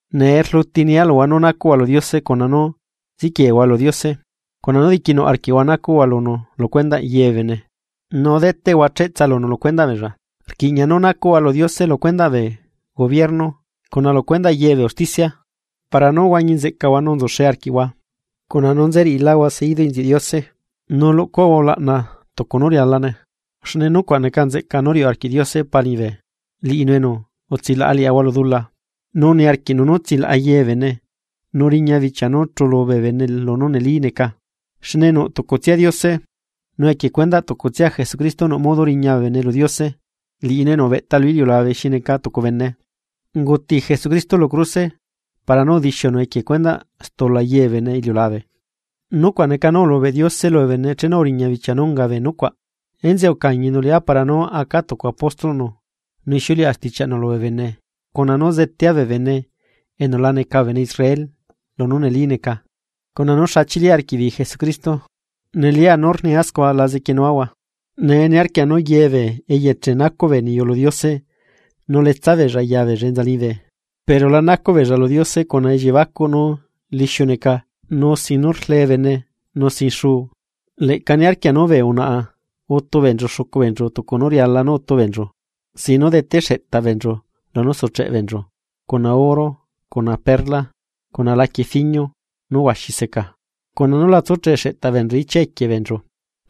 Nee rluti nia luhua nú nacuꞌhua lu Diose, cuna nú ziquieehua lu Diose, cuna nú diquinuꞌ arquiꞌhua nacuꞌhua lunu lu cuendaꞌ ye bee bene, nu deteꞌhua cheꞌtsa lunu lu cuendaꞌ beella. Rquiꞌña nú nacuꞌahua lu Diose lu cuendaꞌ bee gobierno cuna lu cuendaꞌ ye bee usticia, para nú huañi nzeꞌcaꞌahua nu nzuxe arquiaꞌahua, cuna nú nze riꞌilaꞌahua seidu inziuꞌ Diose nu luꞌcuaꞌahua ulaꞌna tucu nú rialane. Xne nucuaꞌ neca nzeꞌca nú riuꞌ arquiꞌ Diose Pa liñibe liꞌinu enu utsilaꞌa liꞌahua lu dula. Nu niarquiꞌnu nú tsilaꞌa ye bee bene nu riña bichia nú chuꞌlu bee bene lunú neli neca. Xne nuꞌ tucutsia Diose, nu equie cuendaꞌ tucutsia Jesucristo nuꞌ modo riña bee bene lu Diose liꞌinu enu ubeꞌta lu iliulabe xi neca tucu bene. Unguti Jesucristo lu cruse para nú udixiunu equie cuendaꞌ stula ye bee bene iliulabe, nucuaꞌ neca nú ulubeꞌ Diose lubee bene chenu uriña bichia nú unga bee nucuaꞌ. Enzeꞌe ucañinu liꞌá para nú aca tucu apóstolꞌnu nu ixiuleꞌa stichiaꞌnu lubee bene cuna nú zetea bee bene enu la neca bee bene Israel lunú neli neca cuna nú xa chili arquiꞌbeei Jesucristo. Nelia nú rnia scua, la zequienuahua. Nee niarquia nú ye bee eyeche nacuꞌ bee niyu lu Diose nu letsa beella yabeella enza liñibe, pero la nacuꞌ beella lu Diose cuna elliebacuꞌ nú lixiu neca nu sin nu rlee bene nu sin xuu. Leꞌca niarquia nú bee unaꞌa utu beenchu xucu beenchu tucu nú riala nú utu beenchu, sin nú dete xeꞌtaꞌ beenchu lunú sucheꞌe beenchu cuna oro cuna perla, cuna laquie fiño nú huaxi seca, cuna nú la tsucheꞌ xeꞌtaꞌ beenchu ichia equie beenchu,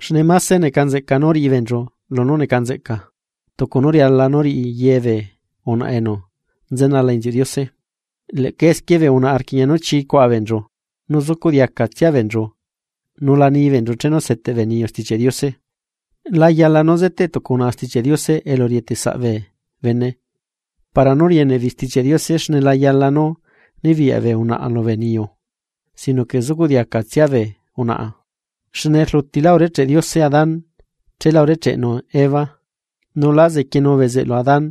xne máse neca nzeꞌca nú riꞌi beenchu lunú neca nzeꞌca, tucu nú riala nú riꞌi ye bee unaꞌa enu nzenala inziuꞌ Diose. Leꞌca esquie bee unaꞌa rquiꞌña nú chii cuaꞌa beenchu nu zucuꞌ diacatsia beenchu nu la ni beenchu chenu seteꞌ bee niyu Stichiaꞌ Diose. La yala nú zeteꞌ tucu unaꞌa Stichiaꞌ Diose elu rieteꞌ saꞌ bee bene para nú rieneꞌbeei Stichiaꞌ Diose xne la yala nú nibiyaꞌ bee unaꞌa lubee niyu. Sino que zucuꞌ diacatsia bee unaꞌa, xne rlutilá urecheꞌe Diose Adán, cheela urecheꞌnu Eva. Nu lá zequienu bezeꞌlu Adán,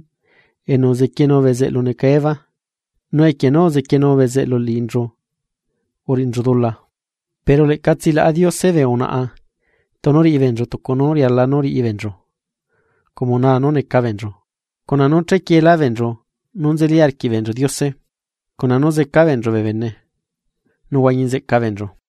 enu uzequienu bezeꞌlu neca Eva, nu equie nú uzequienu bezeꞌlu liꞌinchu uriꞌinchu dula. Pero leꞌca tsilaꞌa Diose bee unaꞌa tunu riꞌi beenchu tucu nú riala nú riꞌi beenchu como naa nú neca beenchu, cuna nú chequieelá beenchu nú nzeli arquiꞌ beenchu Diose, cuna nú zeca beenchu bee bene, nu huañi nzeꞌca beenchu.